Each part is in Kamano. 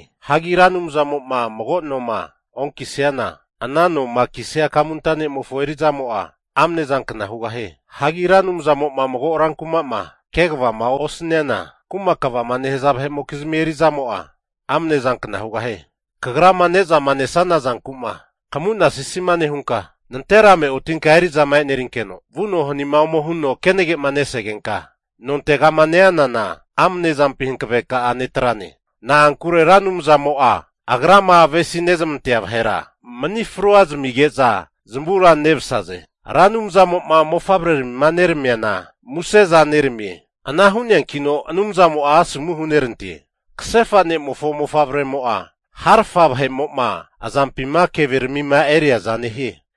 Hagi Ra Anumzamo'ma mago noma onkisiana, ana noma kisia kamunta nemofo eri'zamo'a amne zankna hugahie. Hagi Ra Anumzamo'ma mago rankuma'ma kegavama osaniana, kuma kvama nehaza vahe'mokizmi eri'zamo'a, amne zankna hugahie. Kagrama ne'zama nesana zanku'ma kamu'nasisima nehunka, nanterame otinka eri'zama e'nerinkeno vuno hanima huno kenage'ma nesegenka nontegama neanana, amne zampi hankaveka'a netrane. Na'ankure Ra Anumzamo'a agrama avesi nezmantea vahera mani frua zamige'za zamura nemsaze. Ra Anumzamo'ma mofavreramima neramiana museza neramie. Ana hu'neankino Anumzamo'a asomu hunerante. Kasefa ne'mofo mofavreramimo'za harafa vahe'mo'ma azampima keveramima eriaza nehie.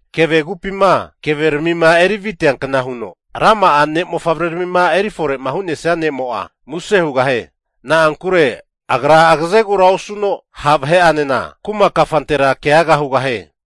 Keve kupima keveramima eri viteankna huno, rama'a ne' mofavreramima eri fore'ma hu'nesia ne'mo'a muse hugahie. Na'ankure agra agazegura osuno ha' vahe'anena kuma kafantera keaga hugahie.